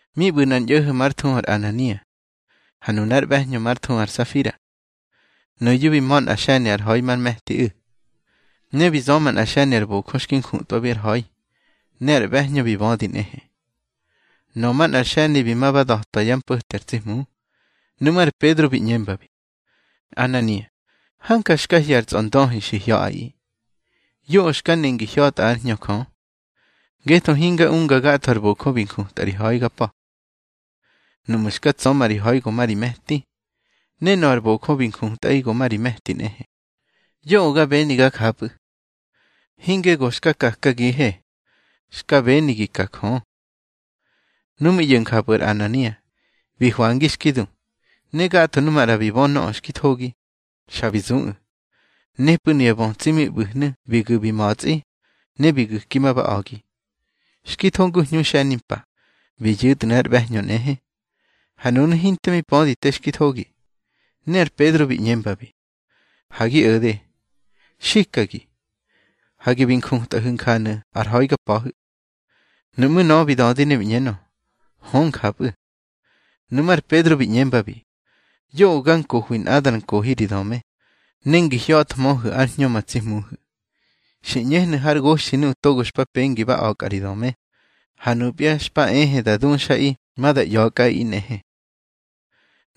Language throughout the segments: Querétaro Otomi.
Mi ꞌbu̱ nꞌar ñꞌo̱ho̱ már thuhu ar Anania, ha nunár ꞌbe̱hñö már thuhu ar Safira. Nuyu̱ bi ma̱ nꞌa xe̱ni ar ha̱i mar me̱tiꞌu̱. Ne bi zöma nꞌa xe̱ni ar bojö xki njutꞌwabi ar ha̱i, ne ár ꞌbe̱hñö bi bödi nꞌehe. Nöꞌö manꞌar xe̱ni bi ma ba da̱twa yá mpo̱te ar tsi Hmu. Nuꞌmú̱ ar Pedro bi ꞌñembabi: —Anania, hanja xka hye̱ ar tsꞌondöhi xi hya̱ꞌaꞌi. Yoꞌö xka ne ngi hya̱tꞌa ár Hñö Jö. Ngetho hinga unga gatho ar bojö bi njutꞌa ri ha̱i ga pa̱. Nuꞌmu̱ xka tsöma ri ha̱i go ma ri me̱ti, ne nöꞌö ar bojö bi njutꞌaꞌi go ma ri me̱ti nꞌehe. Yoꞌö ga beni ga japꞌu̱. Hinge go xka kakagihe, xka beni gi ka Jö. Nu mi ꞌyo̱ njapꞌu̱ ar Anania, bi hwangi xki du. Ne gatho nuꞌu̱ maꞌra bi bö nöꞌö xki thogi, xa bi zuꞌu̱. Nepꞌu̱ nuya bötsi mi ꞌbu̱hnu̱ bi gu̱ bi ma̱tsꞌi, ne bi gu̱ki ma ba a̱gi. Xki tho ngu hñu xe̱nimpa, bi yu̱tnu̱ ár ꞌbe̱hñö nꞌehe. Ha nunu̱ hinte mi pödi te xki thogi. Ne ar Pedro bi ꞌñembabi: —Ha gi o̱de. Xikagi, hage bi njutꞌahu̱ njanu̱ ar ha̱i ga pa̱hu̱. Nuꞌmú̱ nöꞌö bi dödi ne bi ꞌñenö: —Hö, njapꞌu̱. Nuꞌmú̱ ar Pedro bi ꞌñembabi: —Yoꞌö ga nkohwi nꞌada ar nkohi ri döme, ne ngi hya̱thmöhu̱ ár Hñö ma tsi Hmuhu̱. Xi ꞌñehnu̱ har goxthi nuꞌu̱ togo xpa pengi ba a̱kꞌa ri döme, ha nupya xpa ehe da duxꞌaꞌi ma da ꞌya̱kꞌaꞌi nꞌehe.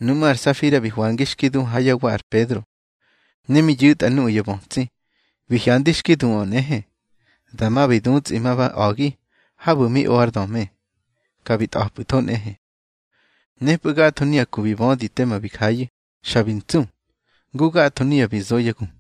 Nuꞌmú̱ ar Safira bi hwangi xki du ha yá wa ar Pedro. Ne mi yu̱tꞌa nuꞌu̱ ya bötsi, bi hyandi xki duꞌö nꞌehe, dama bi dutsꞌi bi ma ba a̱gi habu̱ mi o ár döme, ka bi tꞌa̱pꞌu̱tho nꞌehe. Nepꞌu̱ gatho nuya ku bi bödi tema bi jayu̱, xa bi ntsu, ngu gatho nuya bi zo yá gu.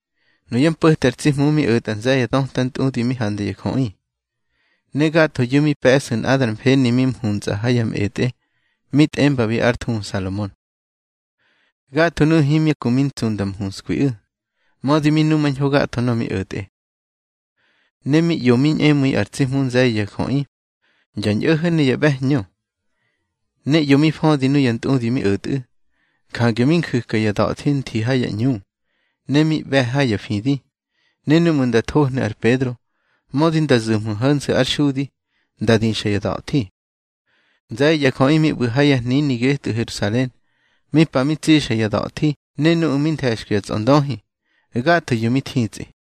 Nuyá mpo̱te ar tsi Hmu mi o̱tꞌa nze̱ye̱ ya döta ntꞌudi mi handa ya jöꞌi. Ne gathoyu̱ mi pe̱sꞌu̱ nꞌada ar mfeni mi mhuntsꞌa ha ya mꞌetꞌe mi tꞌembabi ár thuhu Salomon. Gatho nuꞌu̱ himya ku mi ntsu nda mhunskwiꞌu̱, mödi mi numañho gatho nöꞌö mi o̱tꞌe. Ne mi ꞌyo mi ñꞌemu̱i ar tsi Hmu nze̱ye̱ ya jöꞌi, ya ñꞌo̱ho̱ ne ya ꞌbe̱hñö. Ne ꞌyo mi födi nuya ntꞌudi mi o̱tꞌu̱. Jange mi nju̱ka ya da̱thi nthi ha ya ꞌñu, ne mi ꞌbe̱ ha ya fidi, ne núꞌmu̱ nda thohnu̱ ar Pedro, mödi nda zu̱hmö ho̱nse̱ ár xudi, nda dixa ya da̱thi. Nze̱ye̱ ya jöꞌi mi ꞌbu̱ ha ya hnini getꞌu̱ Herusalen, mi pa mi tsixa ya da̱thi ne nuꞌu̱ mi nthe̱xkwi ya tsꞌondöhi, gathoyu̱ mi thitsꞌi.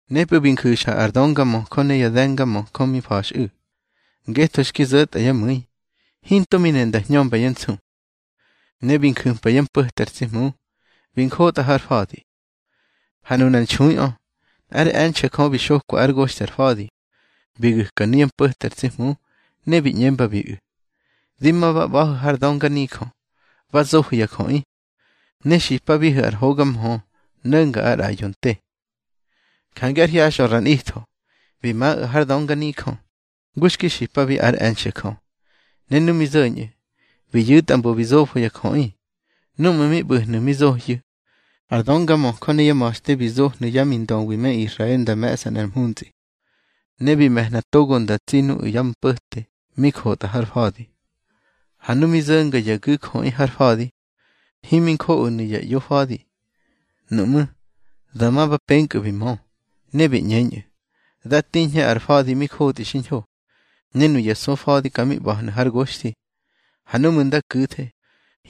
Nepꞌu̱ bi nju̱xa ar döngamöjö ne ya de̱ngamöjö mi mfa̱xꞌu̱, ngetho xki zo̱tꞌa yá mu̱i, hinto mi ne nda hñömba yá nsu. Ne bi nju̱mpa yá mpo̱te ar tsi Hmu, bi njotꞌa har fa̱di. Ha nunar nxuiꞌö, nꞌár e̱nxe̱ Jö bi xokwa ár goxthi ar fa̱di, bi gu̱ka nuyá mpo̱te ar tsi Hmu, ne bi ꞌñembabiꞌu̱: —Di ma ba ꞌba̱hu̱ har dönganijö, ba zohu̱ ya jöꞌi, ne xipabihu̱ ar hoga mhö no̱nga ar ꞌraꞌyo te. Jange ár hyaxꞌö ra nꞌitho, bi maꞌu̱ har dönganijö, ngu xki xipabi ár e̱nxe̱ Jö. Ne nu mi zo̱ñꞌu̱, bi yu̱tꞌa mbo bi zofo ya jöꞌi. Núꞌmu̱ mi ꞌbu̱hnu̱ mi zohyu̱, ar döngamöjö ne yá ma̱xte bi zohnu̱ yá mindöwi me Israel nda me̱ꞌsa nꞌar mhuntsꞌi. Ne bi me̱hna togo nda tsi nuꞌu̱ ya mpo̱te mi jotꞌa har fa̱di. Ha nu mi zo̱nga ya gu̱jöꞌi har fa̱di, himi njoꞌonu̱ ya ꞌyofa̱di. Nuꞌmú̱, dama ba penkꞌu̱ bi mö, ne bi ꞌñeñꞌu̱: —Da tiñhe ar fa̱di mi jotꞌi xiñho, ne nuya sufa̱di ka mi ꞌba̱hnu̱ har goxthi. Ha núꞌmu̱ nda ku̱the,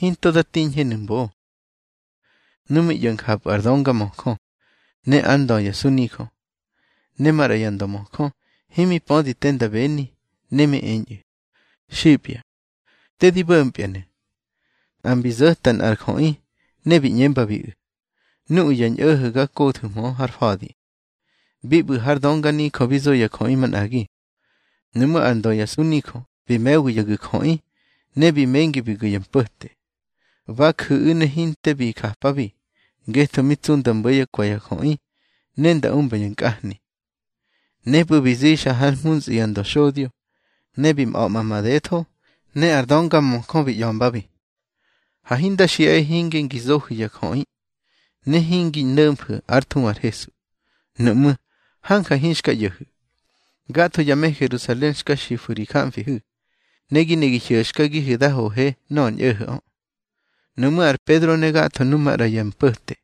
hinto da tiñhenu̱ mbo. Nu mi ꞌyo̱ njapꞌu̱ ar döngamöjö, ne ár ndö ya sunijö, ne maꞌra ya ndömöjö, himi pödi te nda beni, ne mi eñꞌu̱: —Xipya, te di bo̱mpyanu̱. Nꞌa mbi zo̱ta nꞌar jöꞌi, ne bi ꞌñembabiꞌu̱: —Nuꞌu̱ ya ñꞌo̱ho̱ ga kothu̱hmö har fa̱di, bi ꞌbu̱ har dönganijö bi zo ya jöꞌi manꞌagi. Nuꞌmú̱ ár ndö ya sunijö bi me̱wi ya gu̱jöꞌi, ne bi mengi bi gu̱ ya mpo̱te. Ba ju̱ꞌu̱ ne hinte bi japabi, ngetho mi tsu nda mbo̱ yá kwe̱ ya jöꞌi, ne nda umba ya nkꞌahni. Nepꞌu̱ bi zixa hár mhuntsꞌi ya ndöxodyo, ne bi ꞌba̱ꞌma madetho. Ne ar döngamöjö bi ꞌya̱mbabi: —Hage hinda xiꞌahe hinge ngi zohu̱ ya jöꞌi, ne hingi no̱mfu̱ ár thuhu ar Hesu. Nuꞌmú̱, hanja hinxka ꞌyo̱hu̱. Gatho ya me Herusalen xka xifu̱ ri jamfihu̱. Ne gi ne gi hyo̱xkagihe da hoje nöꞌö ar ñꞌo̱ho̱ꞌö. Nuꞌmú̱ ar Pedro ne gatho nu maꞌra ya mpo̱te,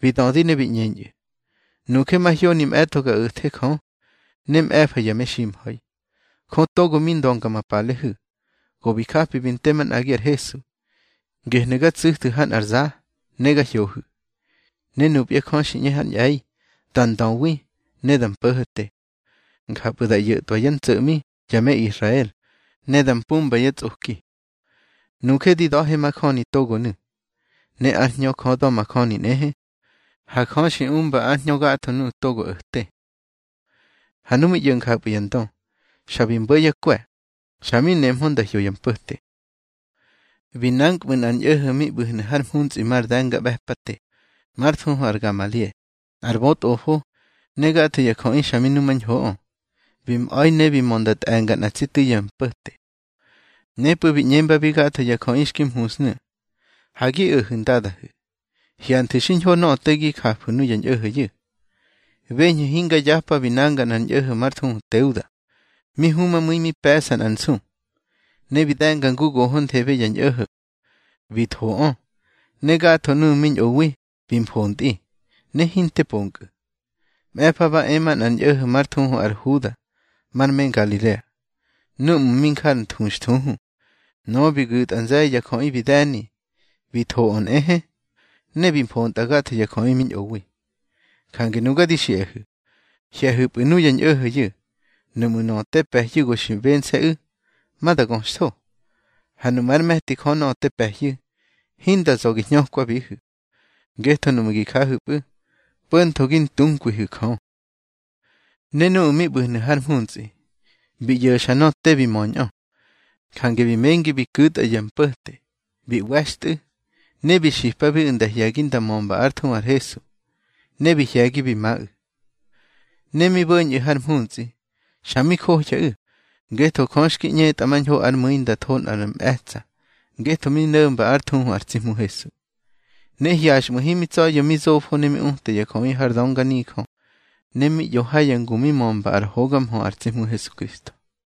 bi dödi ne bi ꞌñeñꞌu̱: —Nuje mahyoni mꞌe̱tꞌo ga o̱the Jö, ne mꞌe̱fa ya meximha̱i. Jö togo mi ndönga ma palehu̱, go bi japi bi nte manꞌagi ar Hesu, gehnu̱ ga tsu̱thu̱ ha nꞌar za, ne ga hyohu̱. Ne nupya Jö xi ꞌñe hár ñꞌe̱i da ndöwi ne da mpo̱ho̱te, njapꞌu̱ da ꞌyo̱tꞌwa yá ntso̱ꞌmi ya me Israel, ne da mpumba yá tsꞌoki. Nuje di da̱he majöni togonu̱, ne ár Hñö Jö da̱majöni nꞌehe, ha Jö xi umba ár Hñö gatho nuꞌu̱ togo o̱te. Ha nu mi ꞌyo̱ njapꞌu̱ ya ndö, xa bi mbo̱ yá kwe̱, xa mi nehmö nda hyo ya mpo̱te. Bi nankꞌmu̱ nꞌar ñꞌo̱ho̱ mi ꞌbu̱hnu̱ har mhuntsꞌi mar de̱ngaꞌbe̱pate, már thuhu ar Gamalie, nꞌar bötꞌofo, ne gatho ya jöꞌi xa mi numañhoꞌö. Bi mꞌa̱i ne bi mö nda tꞌe̱nga nꞌa tsi tu̱i ya mpo̱te. Nepꞌu̱ bi ꞌñembabi gatho ya jöꞌi xki mhunsnu̱: —Ha gi o̱hu̱ ndadahu̱. Hyanthu̱ xiñho nöꞌö te gi jafu̱ nuya ñꞌo̱ho̱yu̱. Beñhu̱ hingar yapa bi nanga nꞌar ñꞌo̱ho̱ mar thuhu Teuda, mi humamu̱i mi pe̱ꞌsa nꞌar nsu, ne bi de̱nga ngu gohonthebe ya ñꞌo̱ho̱. Bi thoꞌö, ne gatho nuꞌu̱ mi ñꞌowi bi mfontꞌi, ne hinte ponkꞌu̱. Mꞌe̱fa ba e manꞌar ñꞌo̱ho̱ már thuhu ar Huda, mar me Ngalilea, núꞌmu̱ mi nja ar nthuxthuhu. Nöꞌö bi gu̱tꞌa nze̱ye̱ ya jöꞌi bi de̱ni. Bi thoꞌö nꞌehe, ne bi mfontꞌa gatho ya jöꞌi mi ñꞌowi. Jange nuga di xiꞌahu̱, hye̱hu̱pꞌu̱ nuya ñꞌo̱ho̱yu̱. Nuꞌmu̱ nöꞌö te pe̱hyu̱ go xi bense̱ꞌu̱, ma da göxtho. Ha nuꞌmu̱ ár me̱ti Jö nöꞌö te pe̱hyu̱, hinda za̱ gi hñökwabihu̱. Ngetho nuꞌmu̱ gi jahu̱pꞌu̱, po̱ntho gi ntunkwihu̱ Jö. Ne nuꞌu̱ mi ꞌbu̱hnu̱ har mhuntsꞌi, bi ꞌyo̱xa nöꞌö te bi möñꞌö. Jange bi mengi bi ku̱tꞌa ya mpo̱te, bi ꞌwe̱xtꞌu̱. Ne bi xipabiꞌu̱ nda hye̱gi nda mömba ár thuhu ar Hesu, ne bi hye̱gi bi maꞌu̱. Ne mi bo̱ñꞌu̱ har mhuntsꞌi, xa mi johyaꞌu̱, ngetho Jö xki ꞌñetꞌamañho ár mu̱i nda tho nꞌar mꞌe̱tsa̱ ngetho mi no̱mba ár thuhu ar tsi Hmu Hesu. Ne hyaxꞌmu̱ himi tsa̱ya̱ mi zofo ne mi uta ya jöꞌi har dönganijö, ne mi ꞌyo ha ya ngu mi mömba ár hoga mhö ar tsi Hmu Hesukristo.